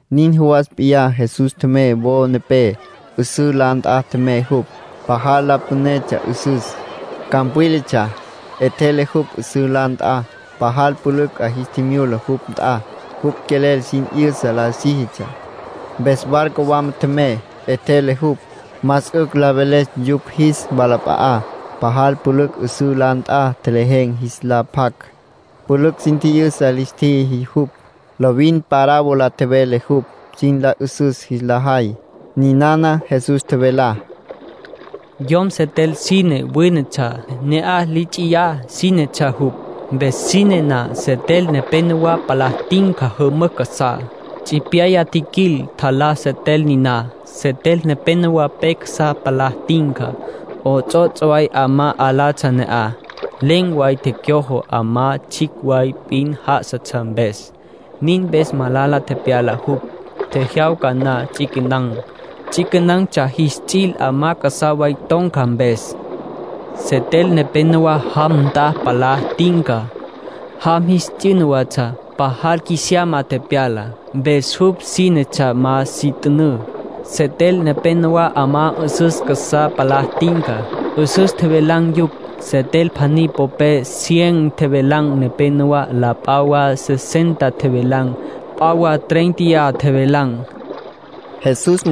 Nin jawas p'iyá Jesús tjemey wo nepé. 'Üsǘ la nt'a tjemey jupj. Pajal la pünetsja 'üsüs. Campwílatsja. 'Etjele jupj 'üsǘ la nt'a. Pajal pülücj 'a jis tjimyula jupj nt'a. Jupj quelel sin 'yüsa la síjitsja. Mpes barco wama tjemey, 'etjele jupj, más 'ücj la veles yupj jis walap'a'á. Pajal pülücj 'üsǘ la nt'a tjelejen̈ jis la pjac. Pülücj sin tji'yüsa lis tjiji jupj. Lovin parábola tjevele jupj, sin la 'üsüs jis la jay. Ninana Jesús tjevelá: “Yom setel sine wínetsja. Na'aj li ts'iyá sínetsja jupj. Mpes sine na, setel nepenowá palá tinca jümücj casá. Tsipyaya tjiquil, tjalá setel niná. Setel nepenowá pe casá palá tinca. 'Ots'ots' way 'amá 'alatsja ne'aj. Len̈ way tecyojo, 'amá tsjicj way p'in já'asatsja mpes. Nin mpes malala tepyala jupj. Tjejyawca na ts'iquenan̈. Ts'iquenan̈tsja jis ts'il 'amá casá way ton̈ca mpes. Setel nepenowá jam nt'a palá tinca. Jam jis t'yüna watsja. Pajal qjuisiyama tepyala, mpes jupj sínetsja ma si t'ünǘ. Setel nepénowa 'amá 'üsüs casá palá tinca. 'Üsüs tjevelan̈ yupj. Setel pjaní popé cien tjevelan̈ nepenowá. La p'a wa sesenta tjevelan̈. P'a wa tréinteya tjevelan̈”, nin tjevele Jesús.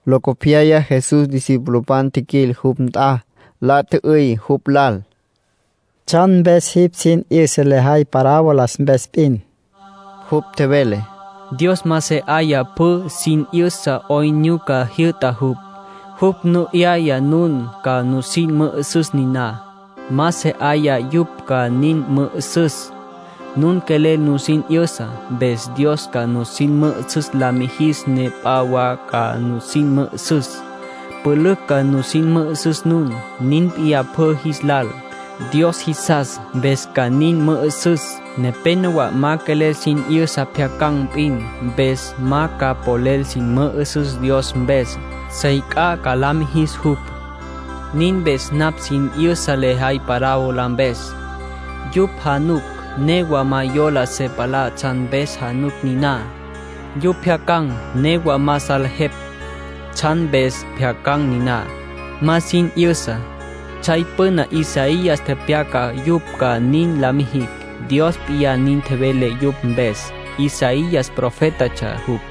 Locopyaya Jesús discipulopan tjiquil jupj nt'a, la tjü'üy jupj lal: —¿Tsjan mpes jipj sin 'yüsa lejay parábola mpes p'in? Jupj tjevele: —Dios ma se 'aya pjü sin 'yüsa 'oyn nyuca jyü'ta jupj. Jupj nu 'yaya nun ca nusin mü'üsüs niná. Ma se 'aya yupj ca sin mü'üsüs. Nun quelel nusin 'yüsa, mpes Dios ca nusin mü'üsüs la mijis ne p'a wa ca nusin mü'üsüs. Pülücj ca nusin mü'üsüs nun. Nin p'iyá pjü jis lal. Dios jisas, mpes ca sin mü'üsüs. Nepénowa ma quelel sin 'yüsa. Pjyacan̈ p'in. Mpes ma ca polel sin mü'üsüs Dios mpes. Sey c'a ca la mijis jupj. Nin mpes napj sin 'yüsa lejay parábola mpes. Yupj januc, newa ma yola se palá tsjan mpes januc niná. Yupj pjyacan̈, newa ma salejepj tsjan mpes pjyacan̈ niná. Ma sin 'yüsa. Tsjay püna Isaías tepyaca yupj ca nin la mijicj. Dios p'iyá nin tjevele yupj mpes. Isaías profétatsja jupj.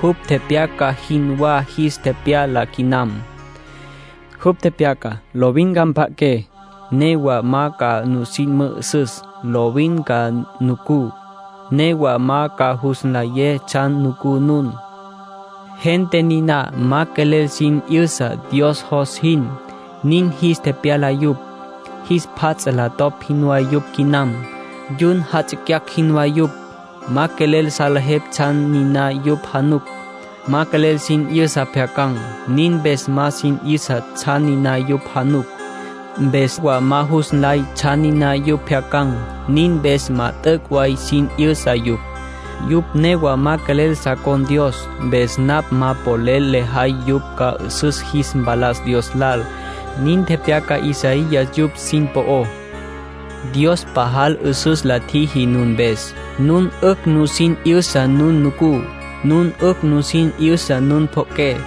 Jupj tepyaca jinwá jis tepyala quinam. Jupj tepyaca: ‘Lovin ca mpja'aqué, newa ma ca nusin mü'üsüs. Lovin ca nucú, newa ma ca jus nlayé tsjan nucú nun. Gente niná ma quelel sin 'yüsa Dios jos jin, nin jis tepyala yupj. Jis pjat la topj jinwá yupj quinam. Yun jatsicyacj jinwá yupj. Ma quelel salejepj tsjan niná yupj januc. Ma quelel sin 'yüsa pjyacan̈. Nin mpes ma sin 'yüsa tsjan niná yupj januc. Mpes wa ma jus nlay tsjan niná yupj pjyacan̈. Nin mpes ma t'üc' way sin 'yüsa yupj. Yupj newa ma quelel sa con̈ Dios, mpes napj ma polel lejay yupj ca 'üsüs jis mpalas Dios lal.’ Nin tepyaca Isaías yupj sin po'ó. ”Dios pajal 'üsüs la tjiji nun mpes. Nun 'ücj nusin 'yüsa nun nucú. Nun 'ücj nusin 'yüsa nun pjo'oqué.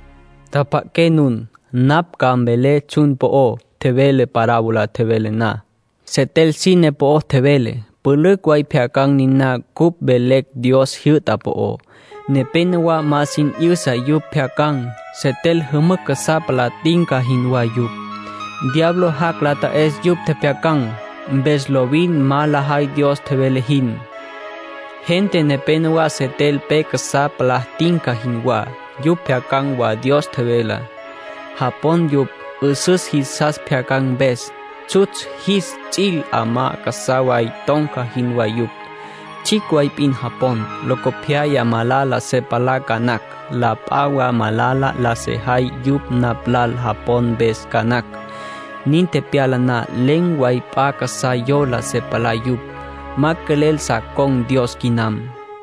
”Tjapja'aqué nun. Napj ca mvelé tsjan po'o tjevelé parábola tjevelé na. Setel sine po'o tjevelé. Pülücj way pjyacan̈ niná cupj velecj Dios jyü'ta po'ó. Nepénowa ma sin 'yüsa yupj pjyacan̈. Setel jümücj casá palá tinca jinwá yupj. Diablo jac' la ta'es yupj tjepjyacan̈. Mpes lovin ma lajay Dios tjevele jin. Gente nepénowa setel pe casá palá tinca jinwá. Yupj pjyacan̈ wa Dios tjevelá. Japon yupj. 'Üsüs jisas tjepjyacan̈ mpes. Tsjutsj jis ts'il 'amá casá way ton̈ca jinwá yupj. Tsjicj way p'in japon. Locopyaya malala se palá ca nacj. La p'a wa malala la sejay yupj napj lal japon mpes ca nacj. Nin tepyala na, len̈ way p'a casá yola se palá yupj. Ma quelel sa con̈ Dios quinam.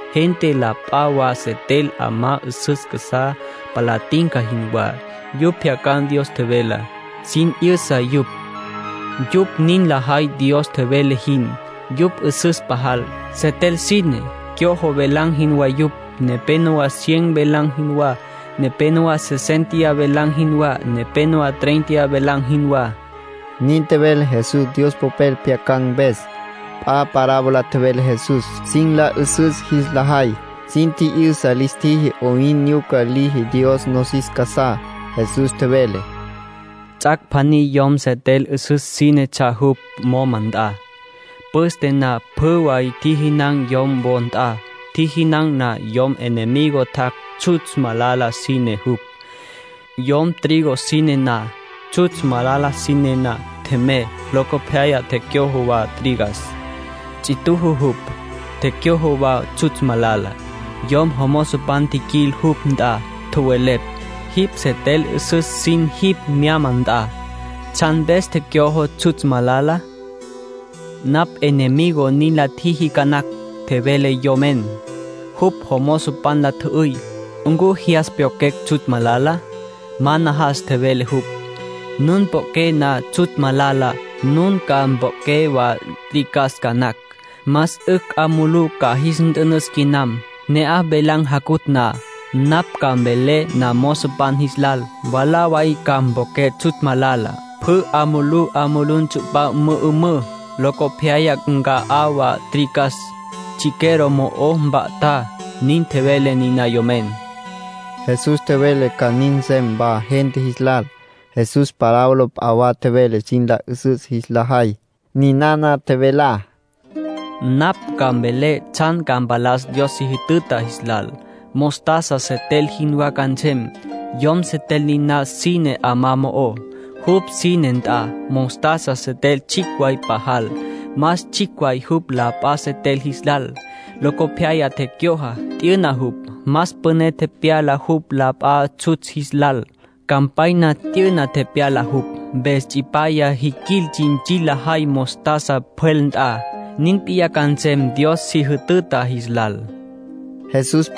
Gente la p'a wa setel 'amá 'üsüs casá palá tinca jinwá. Yupj pjyacan̈ Dios tjevelá. Sin 'yüsa yupj. Yupj nin lajay Dios tjevele jin. Yupj 'üsüs pajal; setel sine, cyojo, velan̈ jinwá yupj. Nepénowa cien velan̈ jinwá. Nepénowa sesénteya velan̈ jinwá. Nepénowa tréinteya velan̈ jinwá —nin tjevele Jesús Dios Popel pjyacan̈ mpes. P'a parábola tjevele Jesús, sin la 'üsüs jis la jay. Sin tji'yüsa lis tjiji 'oyn nyuca liji Dios nosis casá. Jesús tjevele: “Ts'ac' pjaní yom setel 'üsüs sínetsja jupj moma nt'a. Püste na pjü way tjijinan̈ yom wo nt'a. Tjijinan̈ na, jupj enemigo tjac'. Tsjutsj malala sínetsja jupj, yom trigo sine nt'a. Tsjutsj malala sine na, tjemey. Locopyaya tecyojo wa trigas. Ts'ituju jupj. Tecyojo wa tsjutsj malala. Yom jomozopan tjiquil jupj nt'a. Tjowelepj: ‘Jipj setel 'üsüs sin jipj myama nt'a. ¿Tsjan mpes tecyojo tsjutsj malala?’ ‘Napj enemigo nin la tjiji ca nacj’, tjevele yomen. Jupj jomozopan la tjü'üy: ‘¿Ncu jyas pyoqjuecj tsjutsj malala?’ ‘Ma najas’, tjevele jupj. ‘Nun poqjué na tsjutsj malala, nun ca mpoqjué wa trigas ca nacj. Más 'ücj 'a mulú ca jis nt'ünüs quinam. Ne'aj velan̈ jacutj na, napj ca mvelé namozopan jis lal: Mwalá way ca mpoqjué tsjutsj malala. Pjü 'a mulú 'a mulú ntsu'pá mü'ümǘ. Locopyaya nca'á wa trigas. Chiquero mo'o mpa'tá’, nin tjevele niná yomen.” Jesús tjevele ca nin nsem wa gente jis lal. Jesús parábola p'a wa tjevele sin la 'üsüs jis la jay. Ninana tjevelá: “Napj ca mvelé tsjan ca mpalas Dios si jütüta jis lal. Mostaza setel jinwá ca nsem. Yom setel niná sine 'amá mo'ó, jupj sine nt'a. Mostaza setel tsjicj way pajal. Más tsjicj way jupj la p'a setel jis lal. Locopyaya tecyojo, t'yüna jupj. Más püné tepyala jupj la p'a tsjutsj jis lal. Campanya ton̈ca tepyala jupj, mpes tsipyaya jiquil, tsintsil lajay mostaza pjwel nt'a. (Nin p'iyá ca nsem Dios si jütüta jis lal)”, nin tjevele Jesús.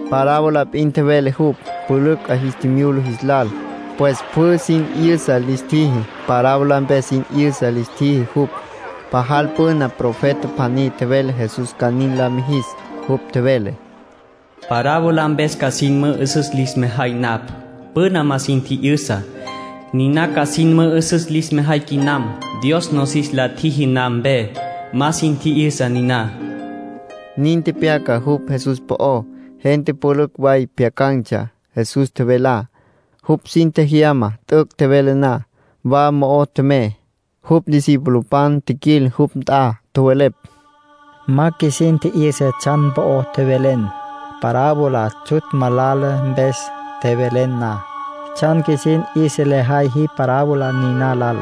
Parábola p'in tjevele jupj, pülücj 'a jis tjimyula jis lal. Pues pjü sin 'yüsa lis tjiji, parábola mpes sin 'yüsa lis tjiji jupj. Pajal püna profeta pjaní tjevele Jesús ca nin la mijis. Jupj tjevele: “Parábola mpes ca sin mü'üsüs lis mejay napj. Püna ma sin tji'yüsa, niná ca sin mü'üsüs lis mejay quinam. Dios nosis la tjiji na mpe, ma sin tji'yüsa niná.” Nin tepyaca jupj Jesús po'ó. Gente pülücj way pjyacan̈tsja Jesús tjevelá. Jupj sin tjejyama t'üc' tjevele na. Wa mo'ó tjemey. Jupj discipulopan tjiquil jupj nt'a. Tjowelepj: —Ma qjuisin tji'yüsa tsjan po'o tjevelen, parábola tsjutsj malala mpes tjevelen na. ¿Tsjan qjuisin 'yüsa lejay jipj parábola niná lal?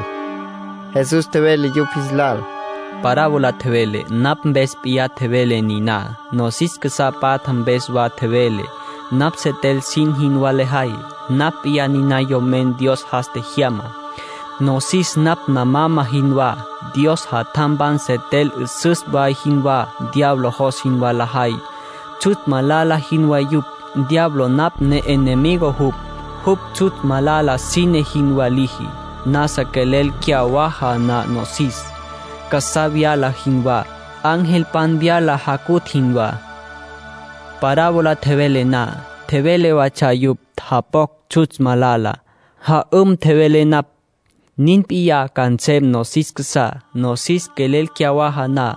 Jesús tjevele yupj jis lal: —Parábola tjevelé, napj mpes p'iyá tjevelé niná. Nosis casá patja mpes wa tjevelé. Napj setel sin jinwá lejay. Napj p'iyá niná Yomen Dios jas tjejyamá. Nosis napj namama jinwá. Dios jatjampan setel 'üsüs way jinwá. Diablo jos jinwá lajay, tsjutsj malala jinwá yupj. Diablo napj ne'enemigo jupj. Jupj tsjutsj malala sine jinwá liji. Nasa quelel cyawaja na nosis, nasa vyala jinwá. Angelpan vyala jacutj jinwá. ”Parábola tjevelé na, tjeveletsja yupj japocj tsjutsj malala. Ja'üm, tjevelé napj. Nin p'iyá ca nsem nosis casá, nosis quelel cyawaja na.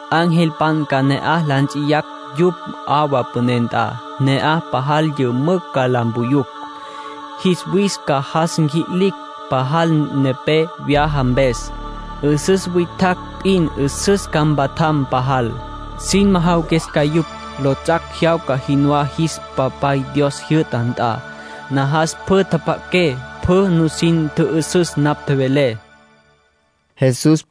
Angelpan ca na'aj la nts'iyacj yupj 'awa püné nt'a. Ne'aj pajal yümücj ca la mpuyucj. Jis wis ca jas nqui'licj, pajal nepé vyaja mpes. 'Üsüs witjacj p'in 'üsüs ca mpatjam pajal. Sin majawaques yupj, lots'ac' jyawca jinwá jis Papay Dios jyü'ta nt'a. Najas pjü tjapja'aqué, pjü nusin tjü'üsüs napj tjevelé —tjevele Jesús.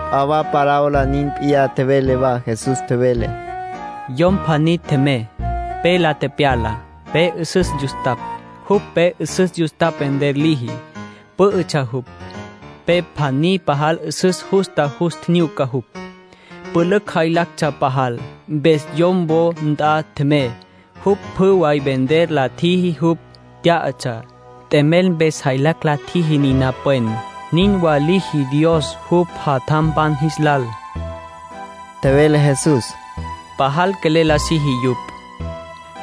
P'a wa parábola nin p'iyá tjevele wa Jesús. Tjevele: —Yom pjaní tjemey, pe la tepyala, pe 'üsüs yustapj. Jupj pe 'üsüs yustapj vender liji, pǘ'ütsja jupj. Pe pjaní pajal 'üsüs justa jus tjinyuca jupj. Pülücj jaylactsja pajal. Mpes yom wo nt'a tjemey. Jupj pjü way vender la tjiji jupj tyá'atsja. T'emel mpes jaylacj la tjiji niná pwen. Nin wa liji Dios jupj jatjampan jis lal —tjevele Jesús—. Pajal quelel la siji yupj.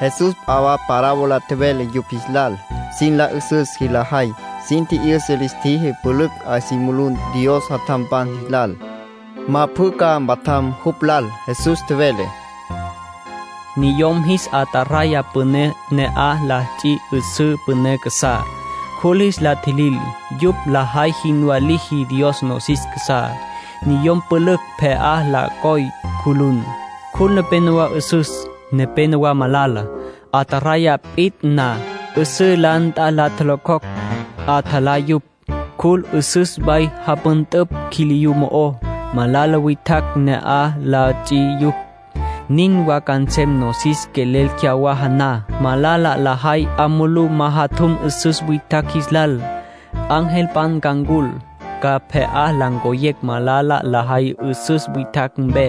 Jesús p'a wa parábola tjevele yupj jis lal, sin la 'üsüs jis la jay. Sin tji'yüsa lis tjiji pülücj 'a si mulú Dios jatjampan jis lal. Ma pjü ca mpatjam jupj lal. Jesús tjevele: —Niyom jis ataraya püné na'aj la ts'i 'üsǘ püné casá, cjul jis la tjilil. Yupj lajay jinwá liji Dios nosis casá. Niyom pülücj pje'á la coy cjulun. Cjul nepénowa 'üsüs, nepénowa malala. Ataraya pit'a na, 'üsǘ la nt'a la locjocj. 'Atjalapj yupj. Cjul 'üsüs way japüntüpj quiliyú mo'ó. Malala witjacj na'aj la ts'i yupj. Nin wa ca nsem nosis quelel cyawaja na —tjevele Jesús—. Malala lajay 'a mulú majatjum 'üsüs witjacj jis lal. Angelpan ca ncul. Ca pje'á la ncoyecj malala lajay 'üsüs witjacj mpe.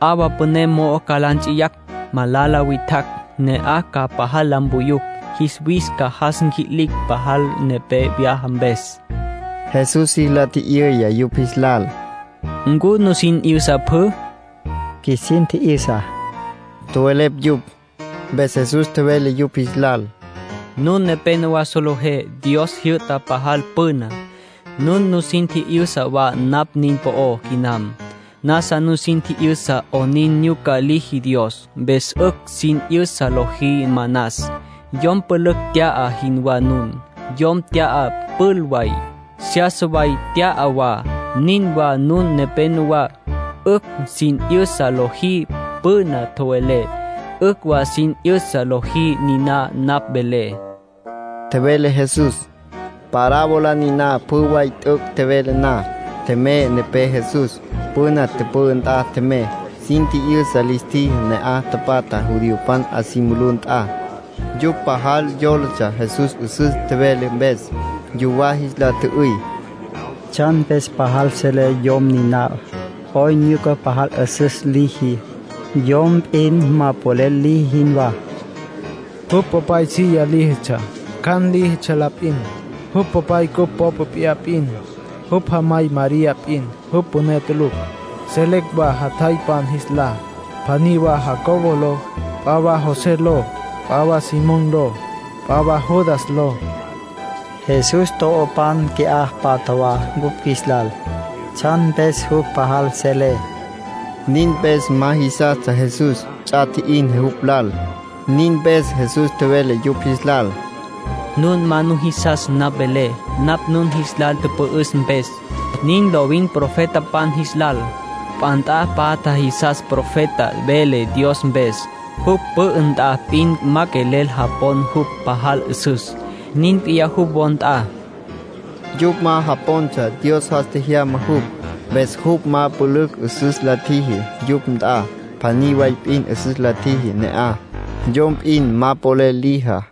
'Awa püné mo'o ca la nts'iyacj malala witjacj. Ne'aj ca pajal la mpuyucj. Jis wis ca jas nqui'licj pajal nepé vyaja mpes —tjevele Jesús. Jesús jis la tji'yüya yupj jis lal: —¿Ncu nusin tji'yüsa pjü? —Qjuisin tji'yüsa —tjowelepj yupj. Mpes Jesús tjevele yupj jis lal: —Nun nepenowá solejé Dios tjijyü'tá pajal püna. Nun nusin tji'yüsa wa napj nin po'ó quinam. Nasa nusin tji'yüsa 'onin nyuca liji Dios. Mpes 'ücj sin 'yüsa lojí manas. Yom pülücj tya'a jinwá nun. Yom tya'a pül way, seyasa way tya'a wa. Nin wa nun nepenowá. 'Ücj sin 'yüsa lojí püna tjowelepj. 'Ücj wa sin 'yüsa lojí niná napj velé —tjevele Jesús. Parábola niná pjü way t'üc' tjevele na, tjemey nepé Jesús. Püna tüpü'ü nt'a tjemey. Sin tji'yüsa lis tjiji ne'aj tapatjá judiopan 'a si mulú nt'a. Yupj pajal yólatsja Jesús 'üsüs tjevele mpes. Yuwá jis la tjü'üy: —¿Tsjan mpes pajal selé yom niná? ¿'Oyn nyuca pajal 'üsüs liji, yom p'in ma polel liji jinwá? Jupj popay silla líjitsja, cjan líjitsja la p'in. Jupj popay cupj popa p'iyá p'in. Jupj jamay María p'in. Jupj püné tulucj. Selecj wa jatjaypan jis lá. Pjaní wa Jacobo ló, p'a wa José ló, p'a wa Simón ló, p'a wa Judas ló. Jesús to'opan qui'á patja wa cupj qjuis lal. ¿Tsjan mpes jupj pajal selé? —nin tjowelepj yupj. Nin mpes ma jisastsja Jesús. Ts'a tji'in jupj lal. Nin mpes Jesús tjevele yupj jis lal: —Nun ma nujisas napj velé, napj nun jis lal tüpü'üs mpes. Nin lovin profetapan jis lal. P'a nt'a patja jisas profeta vele Dios mpes. Jupj pü'ü nt'a p'in ma quelel japon jupj pajal 'üsüs. Nin p'iyá jupj wo nt'a —tjevele Jesús. Yupj ma japontsja Dios jas tjejyama jupj. Mpes jupj ma pülücj 'üsüs la tjiji yupj nt'a. Pjaní way p'in 'üsüs la tjiji ne'aj, yom p'in ma polel lijá.